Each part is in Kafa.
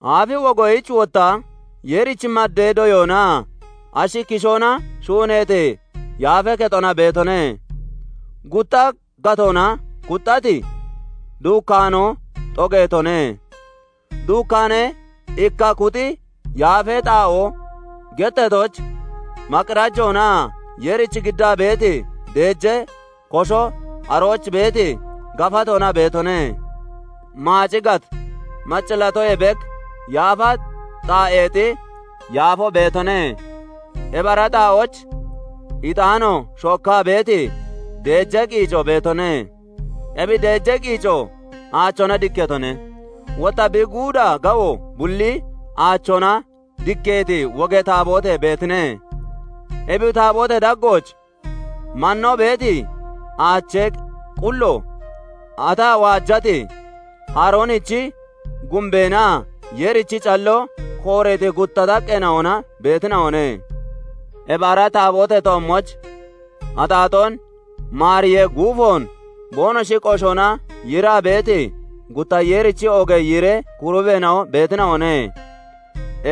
Aafi wogoyich wotta Yeerich maddee doyoonaa ashi kishoona shuuneeti yaafee kexona beetone. Gutta gatoona kuxxati duukkaanoo xogeetone. Duukkaanee ikka kuxi yaafee xaa'oo getteetooch maqirajoonaa Yeerich giddaa beeti deejee kosho arooch beeti gafatoona beetone. Maaci gat maccillaatoyee bek yaafa xaa'eexi yaafoo beetone. Ebi ara xaa'ooch ixaano shookkaa beeti deejee qiico beetone; ebi deejee qiico aachoona dikkeetone; wotta bi guuda gawo bulli aachoona dikkeeti wogee taaboote beetine; ebi taabootee daggooch mannoo beeti aachee qullo, ataa waajati Haroonichi gumbeenaa Yeerichi calloo kooreeti gutta xaqqeena'ona beetina'one. Ebi ara taabootee toommooch axaaxoon maariyee guufoon boonoshi qoshoona yiiraa beeti, gutta Yeerichi oogee yiiree kurubeena'o beetina'one.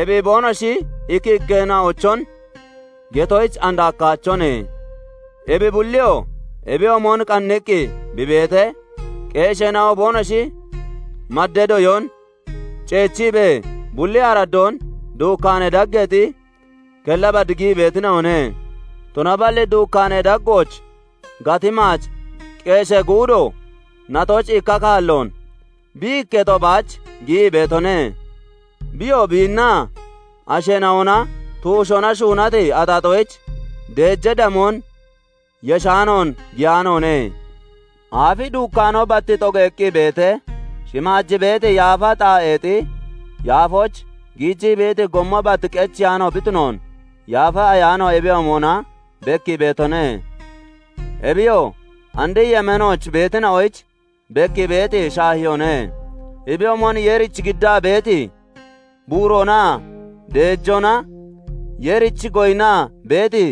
Ebi boonoshi ikki ikkeena'ochon getoyich and hakkaachone. Ebi bulliyoo ebiyoomon qanniqqi bi beetee, qeesheena'o boonoshi maddee doyoon ceechiibee, bulli araddoon duukkaanee daggeexi kella bad giyii beetina'one. Tunaballi duukkaanee daggooch gati maac qeeshee guudo natooch ikka kaalloon bi ikketo baach giyii beetone; biyoo biinnaa asheena'ona tuushoona shuunati axaaxoyich deejee damoon yeshaanoon giyaanoone. Aafi duukkaanoo bat xogeeqqi beetee, shimaaj beeti yaafa xaa'eexi yaafooch giijii beeti gommo bat qecheyaano bi tunoon Yaafa Ayaano ebiyoomona bekkii beetone. Ebiyoo andi yemeenooch beetina'oyich bekkii beeti shaahiyoone. Ebiyoomon Yeerich giddaa beeti buuroonaa deejoona Yeerich goyinnaa beeti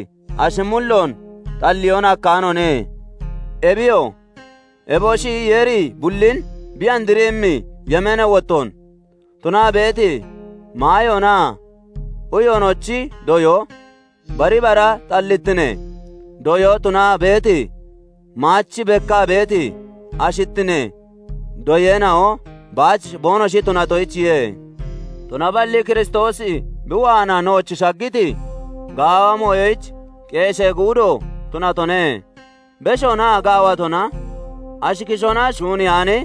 ashi mulloon xalliyoon hakkaanoone. Ebiyoo, eboshi Yeeri bullin bi andriimmi yemeenee wottoon tunaa beeti maayoonaa uyoonochi doyoo, bari bara xallittinee doyoo tunaa beeti maach bekkaa beeti ashittinee doyeena'o baach boonoshi tunatoyichiye. Tunaballi Kiristoosi bi waanaa nooch shaggiti gaawa mooyoyich qeeshee guudo tunatone; beshoonaa gaawatona, ashi kishoona shuuneyaani,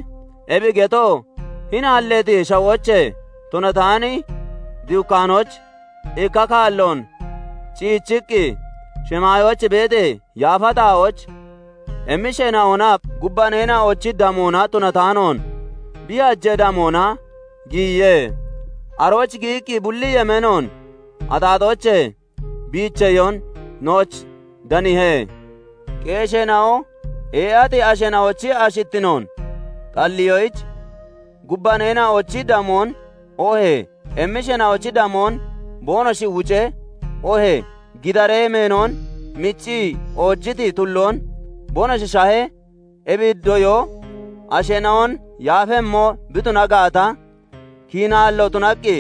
ebi getoo hini halleeti shawoochee tunataani duukkaanooch ikka kaalloon ciichiqqi, shimaayooch beeti yaafa xaa'ooch emmisheena'onaa gubbaneena'onochi damoona tunataanoon, bi hajee damoona giyiye; arooch giyiqqi bulli yemeenoon axaaxoochee biicheyoon nooch daniihe. Qeesheena'o ee'ati asheena'ochi ashittinoon xalliyoyich gubbaneena'ochi damoon oohee emmisheena'ochi damoon boonoshi wucee, oohee gidaree meeno miccii oojiti tulloon boonoshi shahee, ebi doyoo asheena'on yaafemmo bi tuna gaata, kiinaallo tunaqqi,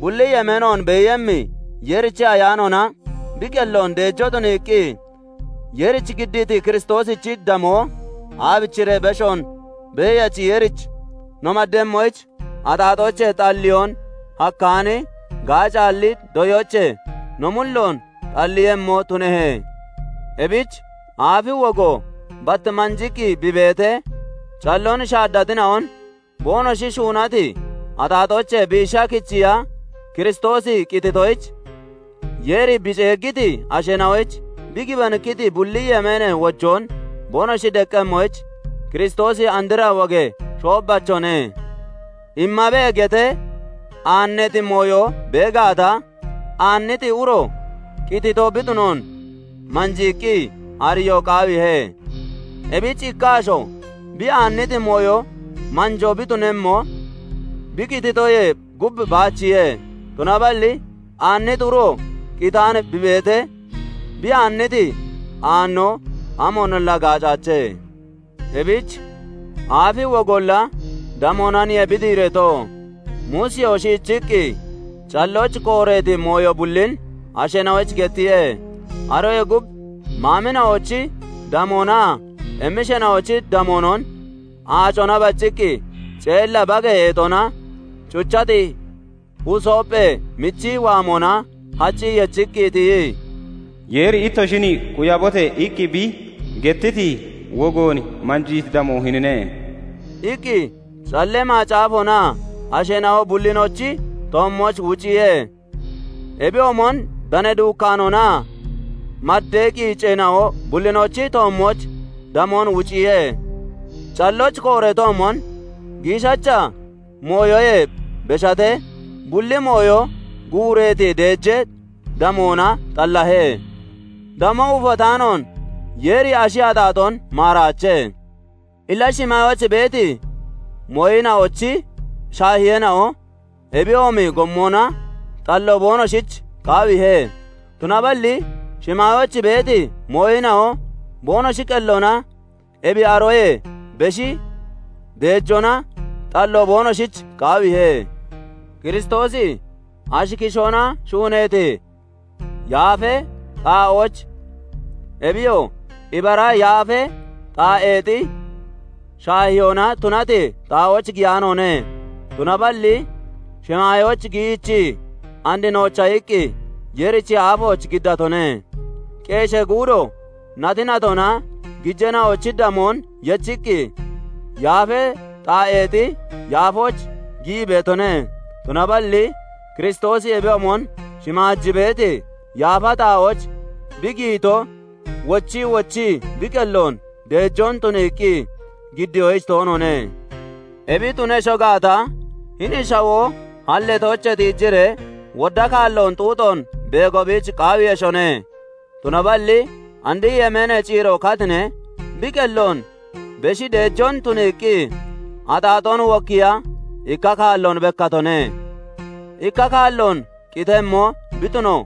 bulli yemeenoon beeyemmi Yeerichi Ayaanoona bi qelloon deejoo tuniiqqi, Yeerich giddiiti Kiristoosichi damoo aabichiree beshoon Beeyachi Yeerich no maddemmoyich, axaaxoochee xalliyoon hakkaani, gaacaalli doyoochee no mulloon xalliiyemmo tunehe? Ebich aafi wogo bat manjiqqi bi beetee, calloon shaaddatina'on boonoshi shuunati axaaxoochee biisha kichiya Kiristoosi qititoyich, Yeeri bi ceeggiti asheena'oyich bi gibanikkiti bulli yemeenee wojoon boonoshi deqqemmoyich Kiristoosi andra wogee shoobbachone. "Immabe" getee aanneeti mooyo bee gaata, aanniti uro qitito bi tunoon manjiiqqi ariyoo qaawiihe. Ebich ikka asho bi aanniti mooyo manjoo bi tunemmo bi qititoyee gub baachiye; tunaballi aanniti uro qitaani bi beetee, bi aanniti aannoo amoonolla gaacaache. Ebich aafi wogolla damoonaniye bi diireeto. Muusiyoo shiichiqqi callooch kooreeti mooyo bullin asheena'oyich gettiye; aroyee gub maamina'ochi damoonaa emmisheena'ochi damoonon aacona bacciqqi ceella bagee eexona cuchati husoophee michi waamona haccii yechiqqi tiyii, "Yeeri ittoshin 'Quyabote!' iqqi bi gettiti wogoon manjiiti damoo hinine" iqqi Callee Macaafoonaa asheena'o bullinochi toommooch wuciye. Ebiyoomon danee duukkaanoonaa maddee qiiceena'o bullinochi toommooch damoon wuciye. Callooch kooreetoomon, giishacha mooyoyee beshatee bulli mooyo guureeti deejee damoona xallahe. Damoo ufataanoon Yeeri ashi axaaxoon maaraache. Illa shimaayooch beeti mooyina'ochi shaahiyeena'o ebiyoomi gommona xallo boonoshich qaawiihe; tunaballi shimaayooch beeti mooyina'o boonoshi qelloona ebi aroyee beshi deejoona xallo boonoshich qaawiihe. Kiristoosi ashi kishoona shuuneeti yaafee xaa'ooch, ebiyoo ibara yaafee xaa'eexi shaahiyoona tunati xaa'ooch giyaanoone; tunaballi shimaayooch giyiichii, and noocha iqqi Yeerichi aafooch giddatone. Qeeshee guudo nati natona gijeena'ochi damoon yechiqqi, yaafee xaa'eexi yaafooch giyii beetone; tunaballi Kiristoosi ebiyoomon shimaaj beeti yaafa xaa'ooch bi giyito, wochii wochii bi qelloon deejoon tuniiqqi giddiyoyich toonoone. Ebi tunesho gaata, hini shawoo halleetoochee tiijiree, wodda kaalloon xuuxoon beego biich qaawiiyeshone; tunaballi and yemeenee ciiro katinee, bi qelloon beshii deejoon tuniiqqi, axaaxoon wokkiiya ikka kaalloon bekkatone. Ikka kaalloon qitemmo bi tuno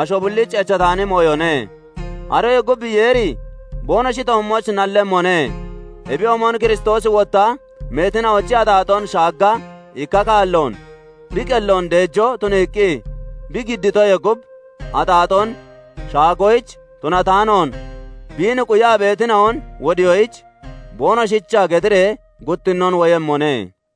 asho bullich echataani mooyone; aroyee gub Yeeri boonoshi toommooch nallemmone; ebiyoomon Kiristoosi wotta meetina'ochi axaaxoon shaagga ikka kaalloon bi qelloon deejoo tuniiqqi bi giddiitoyee gub, axaaxoon shaagoyich tunataanoon, biin quyaa beetina'on wodiyoyich, boonoshicha getiree guttinnoon woyemmone.